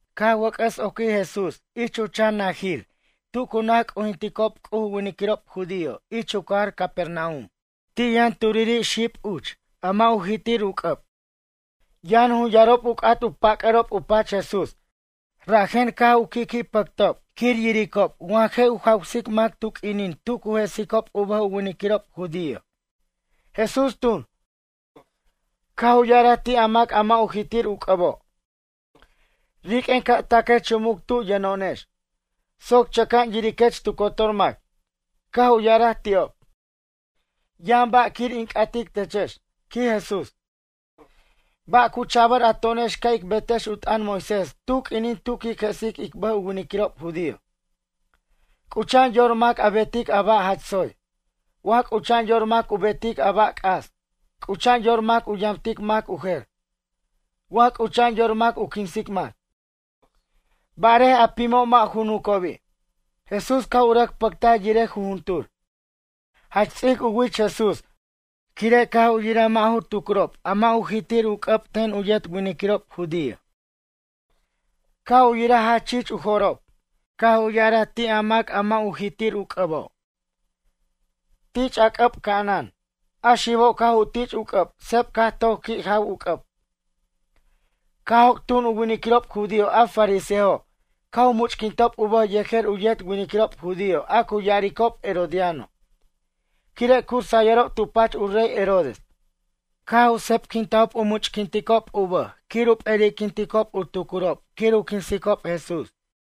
Caj wʌc'ʌs oquij Jesús ich u chan najir tu cu naj c'ujintiob C'uj u winiquirob judío ich u cajar Capernaum. Ti yʌn uch turiri' xib a mʌ' u jitir u c'ʌb. Yʌn jun yarob u c'at u pac'ʌrob u pach Jesús rajen caj u qui'qui' pʌctob quir yiricob wa je' u jawsic mac tu q'uinin tu cu jesic u bʌjob u winiquirob judío. Jesús tun, caj u ya'araj ti' a mac a mʌ' u jitir u c'ʌbo': ―Riq'uen ca' taquech chumuc tu yʌno'onex, soc chʌca'an yiriquech tu cotor mac. Caj u ya'araj ti'ob ―Yʌn ba' quir in c'atic techex ―quij Jesús―. Ba' cu cha'bʌr a to'onex ca' ic betex u t'ʌn Moisés tu q'uinin tu quic jesic ic bʌj u winiquirob judío? C'ucha'an yor mac u betic a ba' jach tsoy, wa c'ucha'an yor mac u betic a ba' c'as? C'ucha'an yor mac u yamtic mac u jer, wa c'ucha'an yor mac u quinsic mac? Barej a pimo' mʌ' ju nucobi'. Jesús caj u rʌc pʌctaj yirej jujuntur, jach ts'ic u wich Jesús quire' caj u yiraj mʌ' ju tucrob a mʌ' u jitir u c'ʌb ten u yet winiquirob judío. Caj u yiraj jach chich u jo'rob. Caj u ya'araj ti' a mac a mʌ' u jitir u c'ʌbo': ―Tich' a c'ʌb ca'anan. A xibo' caj u tich' u c'ʌb seb caj toc qui' jaw u c'ʌb. Caj joc' tun u winiquirob judío a fariseojo' caj u much'quintob u bʌj yejer u yet winiquirob judío a cu ya'aricob herodiano quire' cu sayʌrob tu pach u rey Herodes. Caj u sebquintajob u much'quinticob u bʌj quir u p'eri'quintajob u tucurob quir u quinsicob Jesús.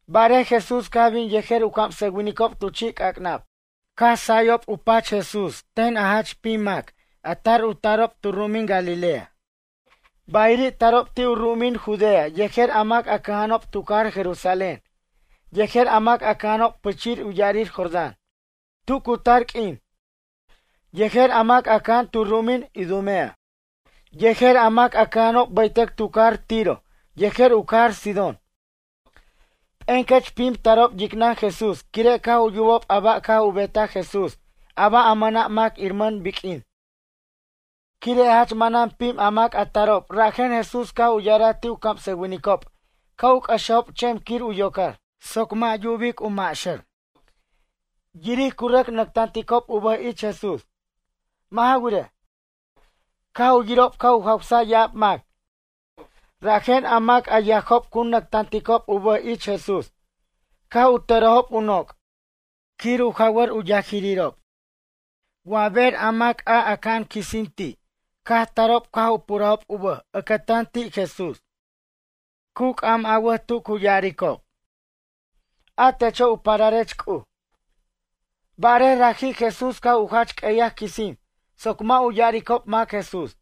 Barej Jesús caj bin yejer u camsʌwinicob tu chi' c'ac'nab. Caj sayob tu pach ten Jesús a jach pim mac a tar u tarob tu ru'umin Galilea. Bayiri' tarob ti' u ru'umin Judea yejer a mac a cʌja'anob tu cajar Jerusalén, yejer a mac a cʌja'anob pichir u ya'arir Jordán tu cu tar q'uin, yejer a mac a cʌja'an tu ru'umin Idumea, yejer a mac a cʌja'anob baytʌc tu cajar Tiro yejer u cajar Sidón. P'encʌch pim tarob yicnʌn Jesús quire' caj u yubob a ba' caj u betaj Jesús a ba' a mʌna' mac iramʌn biq'uin. Quire' jach manan pim a mac a tarob rajen Jesús caj u ya'araj ti' u camsʌwinicob ca' u cʌxejob chem quir u yocar. Yubic cu maxʌr. Yiric cu rʌc nactanticob u bʌj ich Jesús. Mʌ' ja wirej, caj u yirob caj u jawsaj ya'ab mac rajen a mac a yajob cu nactanticob u bʌj ich Jesús caj u tʌrejob u noc' quir u jawʌr u yajiriro'. Wa ber a mac a aca'an quisin ti' caj tarob caj u purajob u bʌj ʌcʌtan ti' Jesús, cu c'am awʌt tu cu ya'aricob: ―A techo' u pararech C'uj. Barej raji' Jesús caj u jach q'ueyaj quisin soc mʌ' u ya'aricob mac Jesús.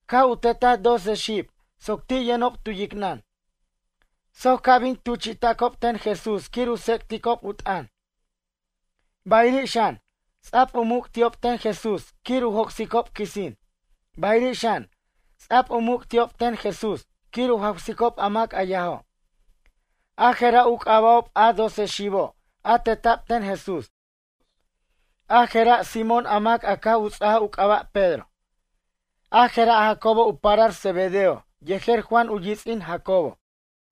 Caj u tetaj doce xib soc ti' yʌnob tu yicnʌn, soc ca' bin tuchi'tacob ten Jesús quir u tsec'ticob u t'ʌn. Bayiri' xan, ts'a'b u muc' ti'ob ten Jesús quir u joc'sicob quisin, bayiri' xan, ts'a'b u muc' ti'ob ten Jesús quir u jawsicob a mac a yajo'. A jera' u c'aba'ob a doce xibo' a teta'b ten Jesús. A jera' Simón a mac caj u ts'aj u c'aba' Pedro. A jera' Jacobo u parar Zebedeo yejer Juan u yits'in Jacobo,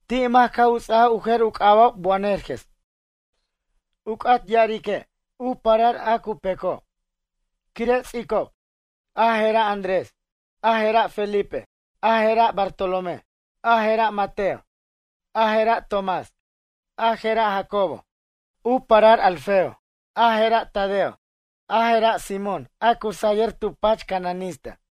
ti' mac caj u ts'aj u jer u c'aba'ob Boanerges, u c'at ya'arique', U Parar A Cu Peco', quire' ts'icob. A jera' Andrés, a jera' Felipe, a jera' Bartolomé, a jera' Mateo, a jera' Tomás, a jera' Jacobo, u parar Alfeo, a jera' Tadeo, a jera' Simón, a cu sayʌr tu pach cananista.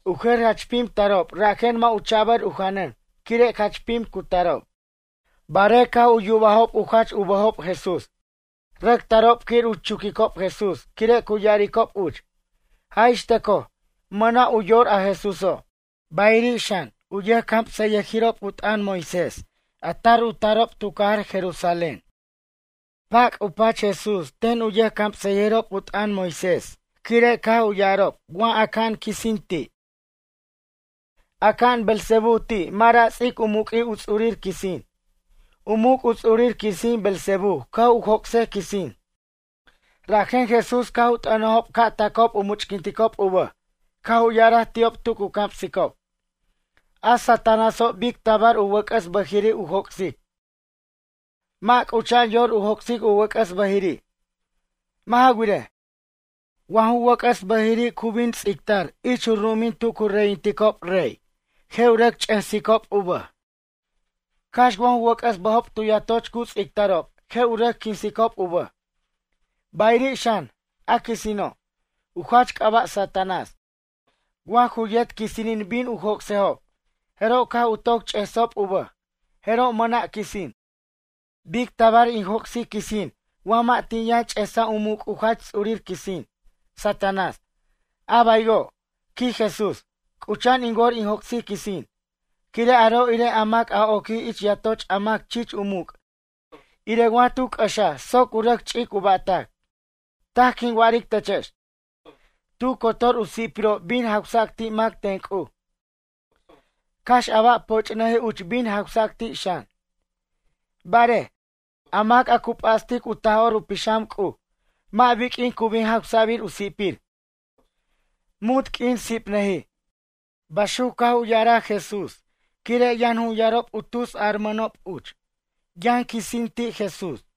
U jer jach pim tarob rajen mʌ' u cha'bʌr u janʌn quire' jach pim cu tarob. Barej caj u yubajob u jach u bʌjob Jesús, rʌc tarob quir u chuquicob Jesús quire' cu ya'aricob uch: ―Jaj ix tʌcoj, mʌna' u yor a Jesúso'. Bayiri' xan, u camsʌyʌjirob u t'ʌn Moisés a tar u tarob tu cajar Jerusalén. Pac' u pach Jesús ten u camsʌyirob u t'ʌn Moisés quire' caj u ya'arob wa aca'an quisin ti': ―Aca'an Beelzebú ti' mʌ' ra' ts'ic u muq'ui' u ts'urir quisin. U muc' u ts'urir quisin Beelzebú caj u joc'sej quisin. Rajen Jesús caj u t'ʌnajob ca' tacob u much'quinticob u bʌj caj u ya'araj ti'ob tu cu camsicob: ―A Satanáso' bic tabar u wʌc'ʌs bʌjiri' u joc'sic? Mʌ' c'ucha'an yor u joc'sic u wʌc'ʌs bʌjiri'. Mʌ' ja wirej, wa ju wʌc'ʌs bʌjiri' cu bin ts'ictar ich u ru'umin tu cu reyinticob rey, je' u rʌc ch'esicob u bʌj. Cax wa ju wʌc'ʌs bʌjob tu yatoch cu ts'ictarob je' u rʌc quinsicob u bʌj. Bayiri' xan, a quisino', u jach c'aba' Satanás, wa ju yet quisinin bin u joc'sejob, jeroj caj u toc ch'esob u bʌj, jeroj mʌna' quisin. ’Bic tabar in joc'sic quisin wa mʌ' tin yʌn ch'esaj u muc' u jach ts'urir quisin, Satanás? A baywo' ―quij Jesús―, c'ucha'an in wor in joc'sic quisin. Quire' aro' irej a mac a oquij ich yatoch a mac chich u muc' irej wa tu c'ʌxaj soc u rʌc ch'ic u ba'tac. ’Taj quin wa'aric techex, tu cotor u si'pirob bin jawsac ti' mac ten C'uj, cax a ba' poch'nʌjij uch bin jawsac ti' xan. Barej, a mac a cu p'astic u Taj'or u Pixam C'uj mʌ' biq'uin cu bin jawsabir u si'pir, munt q'uin sipnʌjij. Baxuc caj u ya'araj Jesús quire' yʌn jun yarob tus yarmʌnob uch: “Yʌn quisin ti' Jesús.”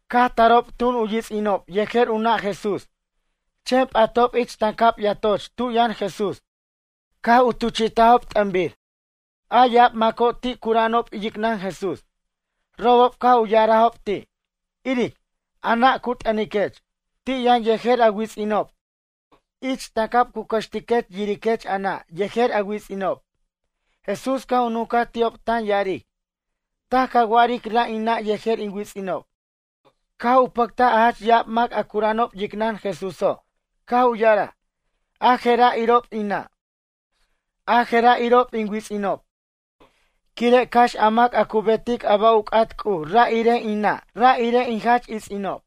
Caj tarob tun u yits'inob yejer u nʌ' Jesús, chen p'atob ich tancab yatoch tu yʌn Jesús, caj u tuchi'tajob t'ʌnbir. A ya'ab maco' ti' cura'anob yicnʌn Jesús, robob caj u ya'arajob ti': ―Iric, a nʌ' cu t'ʌniquech, ti' yʌn yejer a wits'inob ich tancab cu cʌxtiquech yiriquech a nʌ' yejer a wits'inob. Jesús caj u nuncaj ti'ob tan ya'aric: ―Taj ca wa'aric ra' in nʌ' yejer in wits'inob. Caj u pʌctaj a jach ya'ab mac a cura'anob yicnʌn Jesúso', caj u ya'araj: ―A je'ra' irob in nʌ', a jera' irob in wits'inob. Quire' cax a mac a cu betic a ba' u c'at C'uj ra' irej in nʌ' ra' irej in jach its'inob.